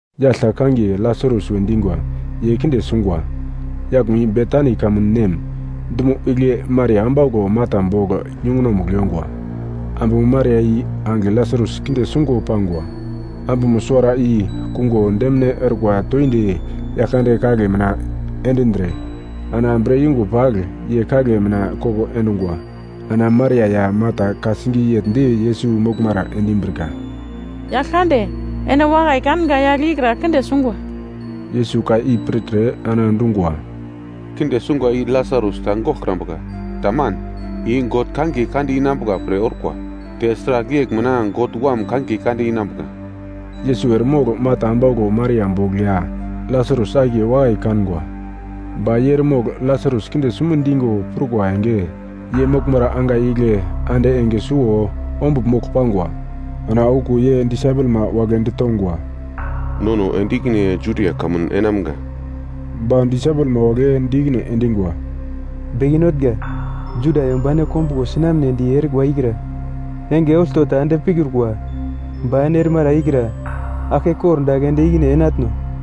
Yagl ta kangiye Lasarus we dingwa ye kinde sungwa. Yaglmo i Betani kamun nem, dumo igle Maria ambauglo Marta bogl yungunomugl yongwa. Ambumo Maria i angigle Lasarus kinde sungo pangwa, ambumo suwara i kungo demine orkwa toindi Yaglkande kagle mina endindre, ana bre yungo pagl ye kagle mina koko endungwa. Ana Maria ya Marta ka-singiye yegl di Yesus moglmara endimbrika, “Yaglkande, ene wakai kanga yagle ikra kinde sungwa.” Yesus ka i pirtre ana dungwa, “Kinde sungwa i Lasarus ta goglkrambuka. Taman. I God kangiye kande inambuka pre orkwa, te sragl yegl mina God Wam kangiye kande inambuka.” Yesus eremogl Marta ambauglo Maria bogl ya Lasarus akiye wakai kangwa. Ba ye eremogl Lasarus kinde sume dingo prukwa enge, ye moglmara angai igle ande enge suwo ombugl mogl pangwa. Ana okuwo ye disaipelma wagle ditongwa, “Nono ende ikine Judia kamun enamga.” Ba disaipelma wagle di ikine endingwa, “Beke Notnga, Juda yomba ene kombuglo sinamnedi erikwa ikra enge olto ta ende pikrukwa, ba ene erimara ikra aglke kordagl ende ikine enatno?”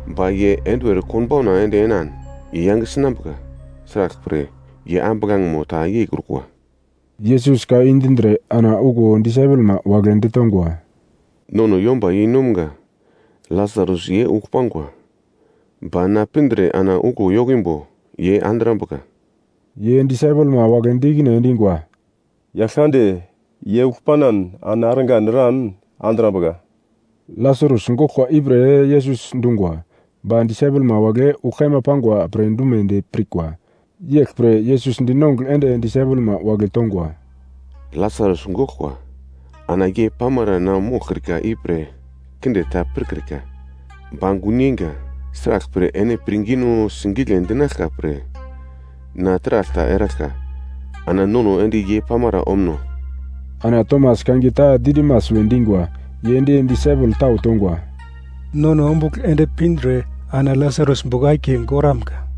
Ba ye enduwer konbauna ende enan ye yange sinambuka, sraglpre, ye ambuglangemo ta yeikrukwa.” Yesus ka i dindre ana okuwo disaipelmo wagle ditongwa, “Nono yomba yeinomga Lasarus ye ugl pangwa, ba na pindre ana uglo yokimbo ye andrambuka.” Ye disaipelma wagle di ikine endingwa, “Yaglkande, ye ugl panan, ana argan eran andrambuka.” Lasarus goglkwa ipre Yesus dungwa, ba disaipelma wagle ugl kaima pangwa pre dumedi pirkwa. Yeglpre Yesus dinongugl ende disaipelma wagle tongwa, “Lasarus goglkwa. Ana ye pamara na moglkrika ipre kinde ta pirkrika, ba gun yeinga. Sraglpre ene pirngino singigle dinaglkwa pre na taragl ta eraglka. Ana nono ende ye pamara omuno.” Ana Tomas kangiye ta Didimas we dingwa ye di disaipel tau tongwa, “Nono ombugl ende pindre ana Lasarus bogl akiye goramga.”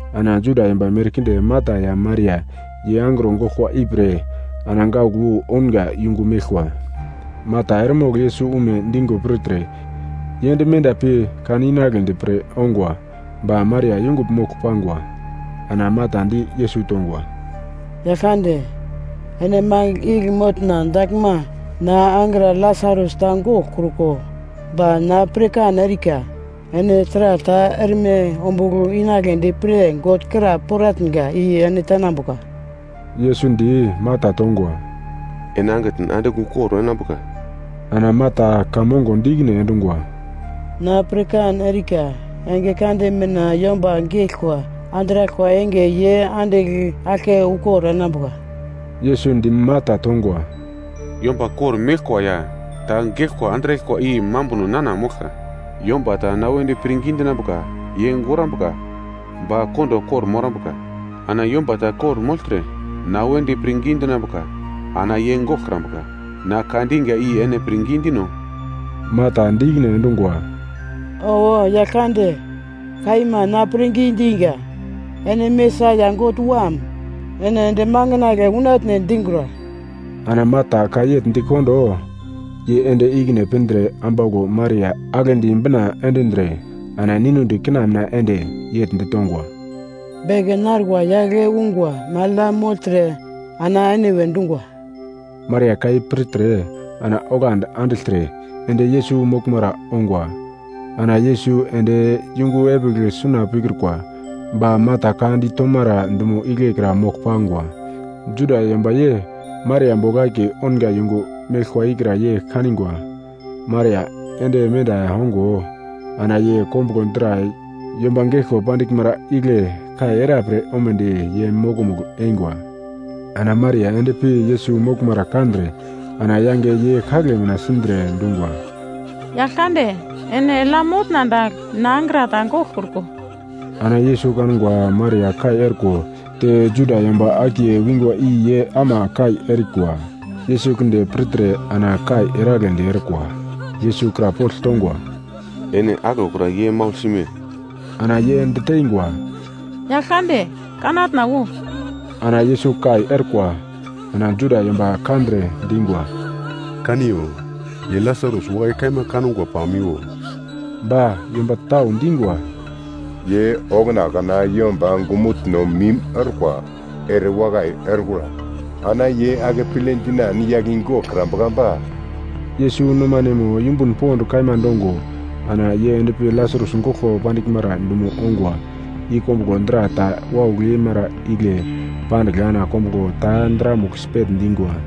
Ana Juda yomba merkinde Marta ya Maria ye angro goglkwa ipre ana gaugl wu ounga yungu meglkwa. Marta eremogl Yesus ume dingo pirtre, ye ende menda pi kan inagledi pre ongwa, ba Maria yungugl mogl pangwa. Ana Marta di Yesus tongwa, “Yaglkande, ene mangigl igle motna daglma, na angra Lasarus ta goglkruko. Ba na pirkan erika, ene taragl ta erme ombugl inagledi pre God kra poratnga i ene tenambuka.” Yesus di Marta tongwa, “Ene angitn andigl ukor enambuka.” Ana Marta ka mongo di ikine endungwa, “Na pirkan erika, enge kande mina yomba geglkwa andraglkwa enge ye andigl aglke ukor enambuka.” Yesus di Marta tongwa, “Yomba kor-meglkwa ya ta geglkwa andraglkwa i mambuno nana moglka. Yomba ta na wedi pirngi dinambuka ye gorambuka ba kondo kor-morambuka. Ana yomba ta kor-mogltre na wedi pirngi dinambuka ana ye goglkrambuka. Na ka dinga i ene pirngi dino?” Marta di ikine endungwa, “Owo, Yaglkande. Kaima na pirngi dinga. Ene Mesaia, God Wam. Ene ende makandle unatne dingura.” Ana Marta ka yegl dikondo, ye ende ikine pindre ambauglo Maria aglendi bina endindre ana ninudi kina mina ende yegl ditongwa, “Beke narikwa yagle ungwa magl ya mogltre ana ene we dungwa.” Maria ka i pirtre ana onglandi andigltre ende Yesus moglmara ongwa. Ana Yesus ende yungu epigl suna pikrukwa, ba Marta ka ditomara dumo igle kra mogl pangwa. Juda yomba ye Maria bogl akiye ounga yungu meglkwa ikra ye kanigwa Maria ende menda ongo, ana ye kombuglo dra yomba geglko pandiglmara igle kai era pre omedi ye mokomugl eingwa. Ana Maria ende pi Yesus moglmara kandre ana yange ye kagle mina sindre dungwa, “Yaglkande, ene eglya motna dagl na angra ta goglkruko!” Ana Yesus kangwa Maria kai orko, te Juda yomba akiye wingwa i ye ama kai erikwa. Yesus kinde pirtre ana kai eragledi orkwa. Yesus krapogl tongwa, “Ene aglokra ye maugl sime?” Ana ye diteingwa, “Yaglkande, kanatna wo.” Ana Yesus kai orkwa. Ana Juda yomba kandre dingwa, “Kaniyo! Ye Lasarus wakai kaima kangwa pamiwo!” Ba yomba tau dingwa, “Ye okuna kana yomba ongumutno mim orkwa erewakai orkura? Ana ye akeple dinan yagle i goglkrambuka ba?” Yesus nomanemo yumbun pond kaima dongo, ana ye endpi Lasarus goglko pandiglmara dumo ongwa. I kombuglo dra ta waugl yeimara igle pandigl ana kombuglo ta dramugl sipegl dingwa.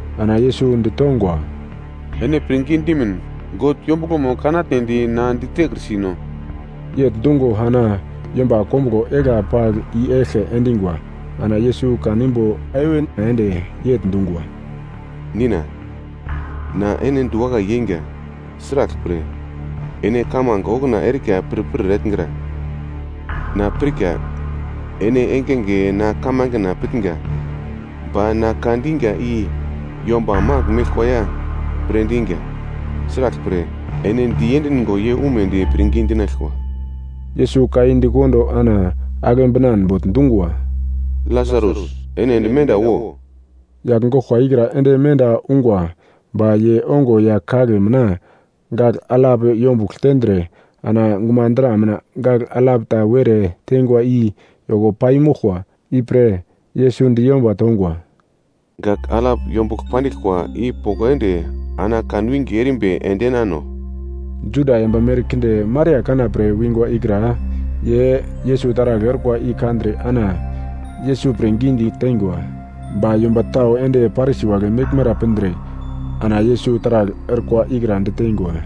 Ana Yesus ditongwa, “Ene pirngi dimin, God yombuglomo kanatnedi na ditekrisino?” Yegl dungo ana yomba kombuglo egla pagl i-eglke endingwa. Ana Yesus kanimbo heven ende yegl dungwa, “Nina, na ene diwakai yeinga, sraglpre ene kamange okuna erika pirpir etngra. Na pirka, ene engenge na kamangena pitnga ba na ka dinga i yomba magl meglkwa ya pre dinga. Sraglpre, ene diendingo ye umedi pirngi dinaglkwa.” Yesus ka i di kondo ana agle binan bogl dungwa, “Lasarus, ene ende menda wo!” Yagl goglkwa ikra ende menda ungwa ba ye ongo ya kagle mina gagl alap yombugl tendre, ana gumadra mina gagl alap ta were teingwa i yoko pai moglkwa. Ipre Yesus di yomba tongwa, “Gagl alap yombugl pandiglkwa i poko ende ana kan winge erimbi endenano.” Juda yomba merkinde Maria kana pre wingwa ikra ye Yesus taragl orkwa i kandre ana Yesus pirngi diteingwa. Ba yomba tau ende Parisi wagle meglmara pindre ana Yesus taragl orkwa ikra diteingwa.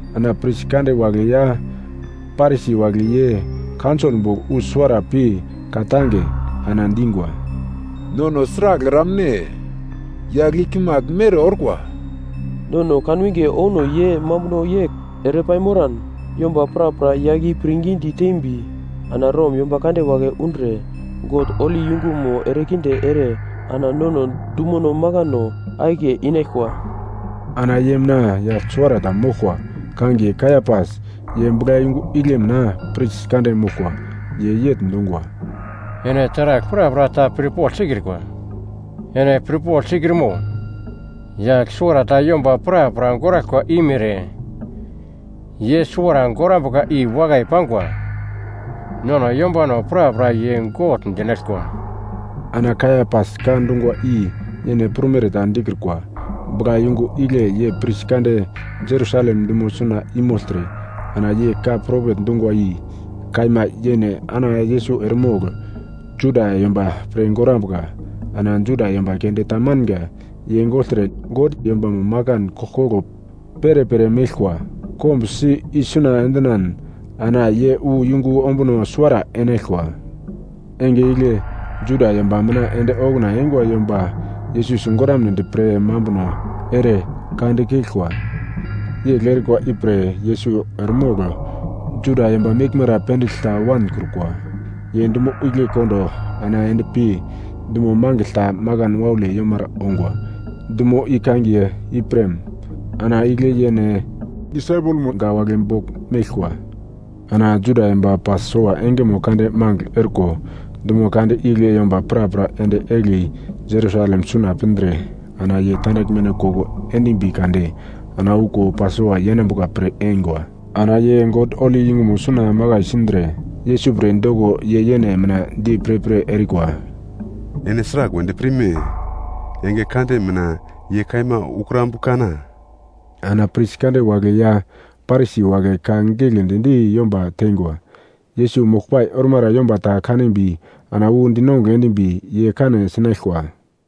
Ana pris kande wagle ya Parisi wagle ye kaunsol bogl wu suwara pi ka-tange, ana dingwa, “Nono sragl eramne? Yagl i kimagl mere orkwa. Nono kanwinge ouno ye mambuno yegl ere paimoran, yomba prapra yagl i pirngidi tembi, ana Rom yomba kande wagle undre God holi yungumo erekinde ere ana nono dumono makano akiye inaglkwa.” Ana ye mina yagl suwarata moglkwa kangiye Kaiapas, ye buglayungu igle mina pris kande moglkwa, ye yegl dungwa, “Ene taragl prapra ta pirpogl sikrikwa! Ene pirpogl sikrimo, yagl suwarata yomba prapra goraglkwa i mere, ye suwara gorambuka i wakai pangwa, nono yombano prapra ye gogl dinaglkwa.” Ana Kaiapas ka dungwa i yene prumere ta dikrukwa, buglayungu igle ye pris kande Jerusalem dumo suna i mogltre, ana ye ka propet dungwa i kaima yene ana Yesus eremogl Juda yomba pre gorambuka. Ana Juda yomba keunde tamanga, ye gogltre God yombamo makan koglkoglo perepere meglkwa kombusi isuna endinan, ana ye wu yungu ombuno suwara enaglkwa. Enge igle Juda yomba mina ende okuna eingwa yomba Yesus sigoramnedi pre mambuno ere ka dikeglkwa. Yegl erikwa ipre Yesus eremogl Juda yomba meglmara pendigl ta wankrukwa. Ye dumo igle kondo ana ende pi dumo mangigl ta makan waule yomara ongwa, dumo i kangiye Iprem. Ana igle yene disaipelmo wagle bogl meglkwa. Ana Juda yomba Pasova engeno kande magl orko, dumo kande igle yomba prapra ende egli Jerusalem suna pindre ana yene tandaglmeno koko endimbi kade ana okuwo Pasova yenambuka pre eingwa. Ana ye God holi yungumo suna makai sindre, Yesus pre doko ye yene mina di pirpir erikwa, “Ene sragl wedi pirme? Enge kande mina ye kaima ukrambu-kana?” Ana pris kande wagle ya Parisi wagle ka giglendi di yomba teingwa. Yesus moglpai ormara yomba ta kanimbi ana wu dinongugl endimbi ye kane sinaglkwa.